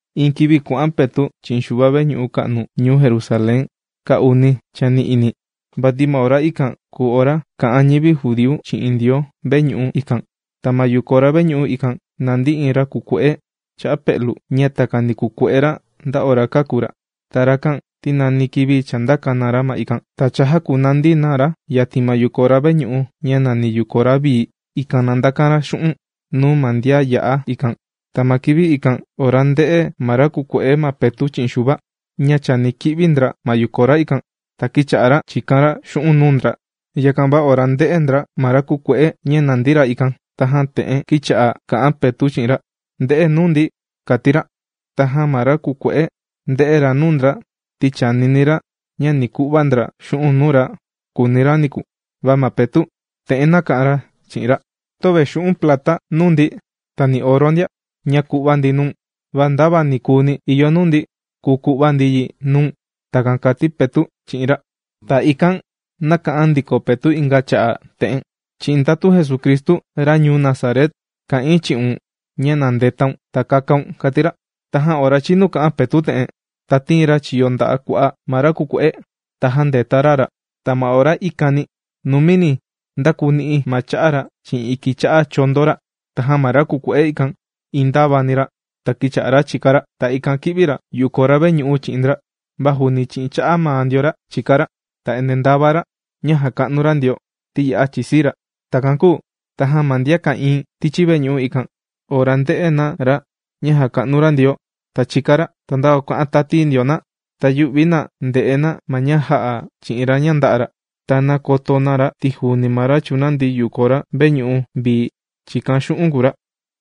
Iin kivi kuà'an Petu' chi'in Xuva veñu'u ka'nu ñuu Jerusalén kaa uni chani'ini, vati ma ora ikan kùu ora kà'an ñivi judíu chi'in Ndioo veñu'u ikan. Ta ma yukora veñu'u ikan nàndi iin ra kùkue'e cha'a pe'lu, ña takani kùkue'e ra nda ora kāku ra. Ta rakan ti nani kivi chàndaka na ra ma ikan, ta chàjakunandi na ra yatin ma yukora veñu'u ña nàni Yukora Vii. Ikan na ndakan ra xu'un' nuu ma ndian yà'a ikan. Ta ma kivi ikan ora ndē'e ma ra kùkue'e ma Petu' chi'in Xuva ña chani ki'vi ndra ma yukora ikan, ta kīcha'a ra chìkan ra xu'un' nuu ndra. Yakan va ora ndē'e ndra ma ra kùkue'e ña nàndi ra ikan, tajan te'en kīcha'a kà'an Petu' chi'in ra: ―¡Nde'e nuu ndi! ―kàti ra. Tajan ma ra kùkue'e, ndē'e ra nuu ndra, ti chànini ra ña ni ku'va ndra xu'un' nuu ra, kùuni ra niku. Va ma Petu' te'en nāka'an ra chi'in ra: ―Töve xu'un' plata nuu ndi ta ni oro ndia, ña ku'va ndi nuu̱n, va ndava ni kùuni ìyo nuu ndi kùu ku'va ndi yi nuu̱n. ―Takan kàti Petu' chi'in ra. Ta ikan nāka'an ndiko Petu' inga cha'a' te'en: ―Chi'in ndatu Jesucristu, ra ñuu Nazaret, kà'in chi'un ña na ndetaun ta kakaun ―kàti ra. Tajan ora chīnu kà'an Petu' te'en, ta tīin ra chiyo nda'a' kua'a ma ra kùkue'e, ta jāndeta ra ra. Ta ma ora ikani numini ndākuu ni'i ma cha'a ra chi'in iki cha'a chondo ra. Tajan ma ra kùkue'e ikan, iin ndāvani ra, ta kīcha'a ra chìka ra. Ta ikan kī'vi ra yukora veñu'u chi'in ndra, va juuni chi'in cha'a maa ndio ra chìka ra. Ta endee ndàva ra ña jàka'nu ra Ndioo ti ya'a chìsii ra. Takan kūu tajan ma ndian ka'ìin tichi veñu'u ikan, ora ndē'e na ra ña jàka'nu ra Ndioo, ta chìka ra, ta ndava kuà'an tati ndio na, ta yū'vi na ndè'e na ma ña jā'a chi'in ra ña ndā'a ra. Ta nākoto na ra ti juuni ma ra chùnandi yukora veñu'u vii chìkan xu'un' kùu ra.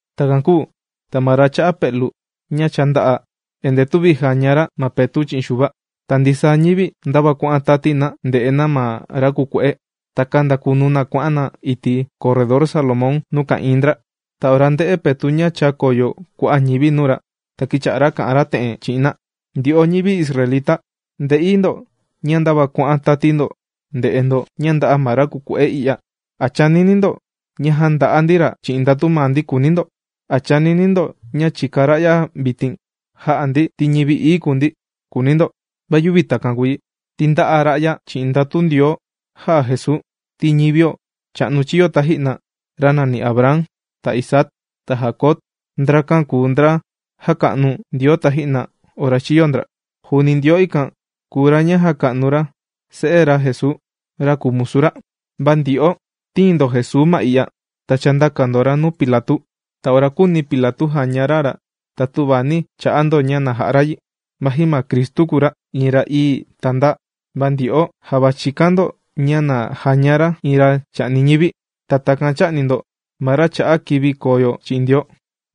Takan kūu ta ma ra cha'a pe'lu ña cha ndā'a, endee tüvi jaña ra ma Petu' chi'in Xuva. Ta ndisaa ñivi ndava kuà'an tati na ndè'e na ma ra kùkue'e. Ta kāndakunu na kuà'an na iti' Corredor Salomón nuu ka'ìin ndra. Ta ora ndē'e Petu' ña chākoyo kua'a' ñivi nuu ra, ta kīcha'a ra kà'an ra te'en chi'in na: ―Ndyo'o ñivi israelita, ndè'i ndo ña ndava kuà'an tati ndo ndè'e ndo ña ndā'a ma ra kùkue'e i'ya. ¿A chànini ndo ña jānda'a ndi ra chi'in ndatu maa ndi?, kùuni ndo. ¿A chànini ndo ña chìka ra'ya vitin jà'a ndi ti ñivi ií kùu ndi?, kùuni ndo. ¡Va yüvi takan kùu yi! Ti ndā'a ra'ya chi'in ndatu Ndioo jà'a Jesuu. Ti ñivio cha'nu chīyo taji'na, ra nani Abraham, ta Isaac, ta Jacob, ndrakan kùu ndra jāka'nu Ndioo taji'na ora chīyo ndra. Juuni Ndioo ikan kùu ra ña jāka'nu ra Se'e ra Jesuu, ra kùu musu ra. Va ndyo'o tīin ndo Jesuu ma i'ya ta chāndaka ndo ra nuu Pilatu. Ta ora kūuni Pilatu jaña ra ra ta tüvi nī cha'a ndo ña na ja'a ra yi, vaji ma Cristu kùu ra iin ra ií ta ndaa. Va ndyo'o java chīkan ndo ña na jaña ra iin ra chà'ni ñivi. Ta takan chā'ni ndo ma ra chà'a kivi koo yo chi'in Ndioo.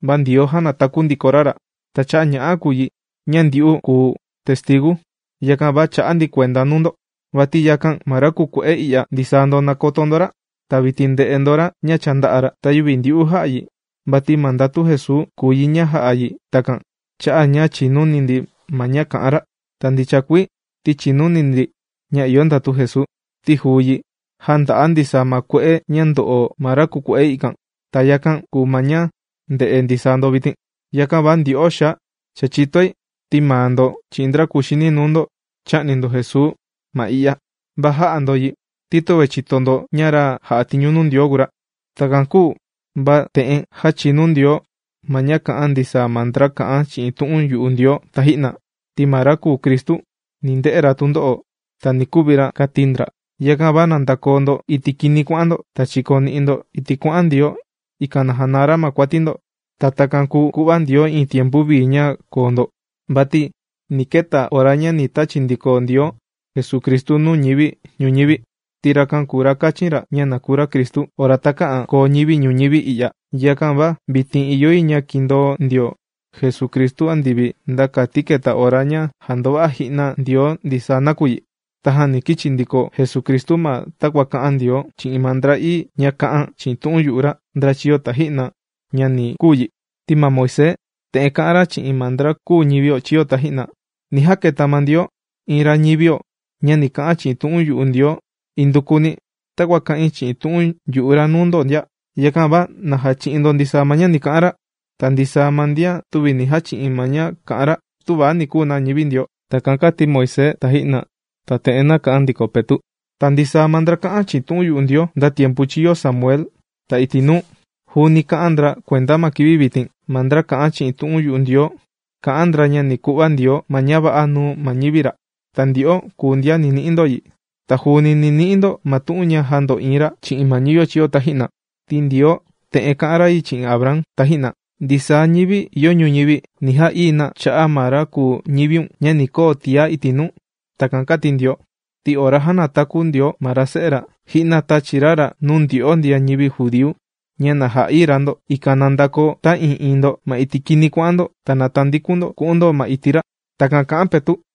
Va Ndioo jānataku ndiko ra ra. Ta cha'a' ña'a kùu yi ña ndyu'u kùu testigu, yakan va chà'a ndi kuenda nuu ndo. Vati yakan va ma ra kùkue'e i'ya ndisaa ndo nàkoto ndo ra, ta vitin ndè'e ndo ra ña cha ndā'a ra. Ta yüvi ndyu'u jā'a yi, vati ma ndatu Jesuu kùu yi ña jā'a yi takan cha'a' ña chìnuni ndi ma ña kà'an ra. Ta ndicha kuii ti chìnuni ndi ña ìyo ndatu Jesuu, ti juu yi jānda'a ndisaa ma kue'e ña ndo'o ma ra kùkue'e ikan. Ta yakan kùu ma ña ndè'e ndisaa ndo vitin. ’Yakan va ndyo'o xaa, cha chìtoi ti maa ndo chi'in ndra kuxini nuu ndo chā'ni ndo Jesuu ma i'ya. Va jā'a ndo yi ti töve chīto ndo ña ra jà'a tiñu Ndioo kùu ra. Takan kūu va te'en jāchinu Ndioo ma ña kā'an ndisaa ma ndra kà'an chi'in tu'un yu'u Ndioo taji'na: ti ma ra kùu Cristu ni nde'e ra tundo'o, ta ni kuvi ra, kāti ndra. Yakan va na ndakoo ndo iti' kini kuà'an ndo, ta chikoni'i ndo iti' kuà'an Ndioo, ikan na janaa ra ma kuati ndo. Ta takan kùu ku'va Ndioo iin tiempu vii ña koo ndo. Vati ni keta ora ña ni tachi ndiko Ndioo ma Jesucristu nuu ñivi ñuñivi, ti rakan kùu ra kāchin ra ña na kuu ra Cristu, ora takä'an koo ñivi ñuñivi i'ya. Yakan va vitin ìyo yi ña kindoo ndio Jesucristu andivi, nda kati keta ora ña jàndova'a ji'na Ndioo ndisaa nakuyi. Tajan ni kichi ndiko Jesucristu ma takua kā'an Ndioo chi'in ma ndra ií ña kā'an chi'in tu'un yu'u ra, ndra chīyo taji'na, ña ni kuu yi. Ti ma Moisés te'en kā'an ra chi'in ma ndra kūu ñivio chīyo taji'na: “Ni jaketa ma Ndioo iin ra ñivio ña ni ka'an chi'in tu'un yu'u Ndioo indukuni takua kà'in chi'in tu'un yu'u ra nuu ndo ndia. ¡Yakan va na jachi'in ndo ndisaa ma ña ni ka'an ra! Ta ndisaa ma ndian tüvi ni jachi'in ma ña kà'an ra, tüva ni kuu na ñivi Ndioo.” Takan kāti Moisés taji'na. Ta te'en nāka'an ndiko Petu': ―Ta ndisaa ma ndra kā'an chi'in tu'un yu'u Ndioo, nda tiempu chīyo Samuel ta iti' nuu, juuni kā'an ndra kuenda ma kivi vitin. Ma ndra kà'an chi'in tu'un Ndioo kà'an ndra ña ni ku'va Ndioo ma ña va'a nuu ma ñivi ra. Ta ndyo'o kùu ndian ni ni'i ndo yi. Ta juuni ni ni'i ndo ma tu'un ña jāndo'iin ra chi'in ma ñivio chīyo taji'na. Ti Ndioo te'en kā'an ra yi chi'in Abraham taji'na: “Ndisaa ñivi ìyo ñuñivi ni ja'ii̱ na cha'a' ma ra kùu ñiviun ña ni koo tiá iti' nuu.” Takan kāti Ndioo. Ti ora jānataku Ndioo ma ra Se'e ra, ji'na tāchi ra ra nuu ndyo'o ndian ñivi judíu ña na ja'ií ra ndo, ikan na ndakoo ta'ii'iin ndo ma iti' kini kuà'an ndo ta na tandikun ndo ku'un ndo ma iti' ra. ―Takan kà'an Petu'.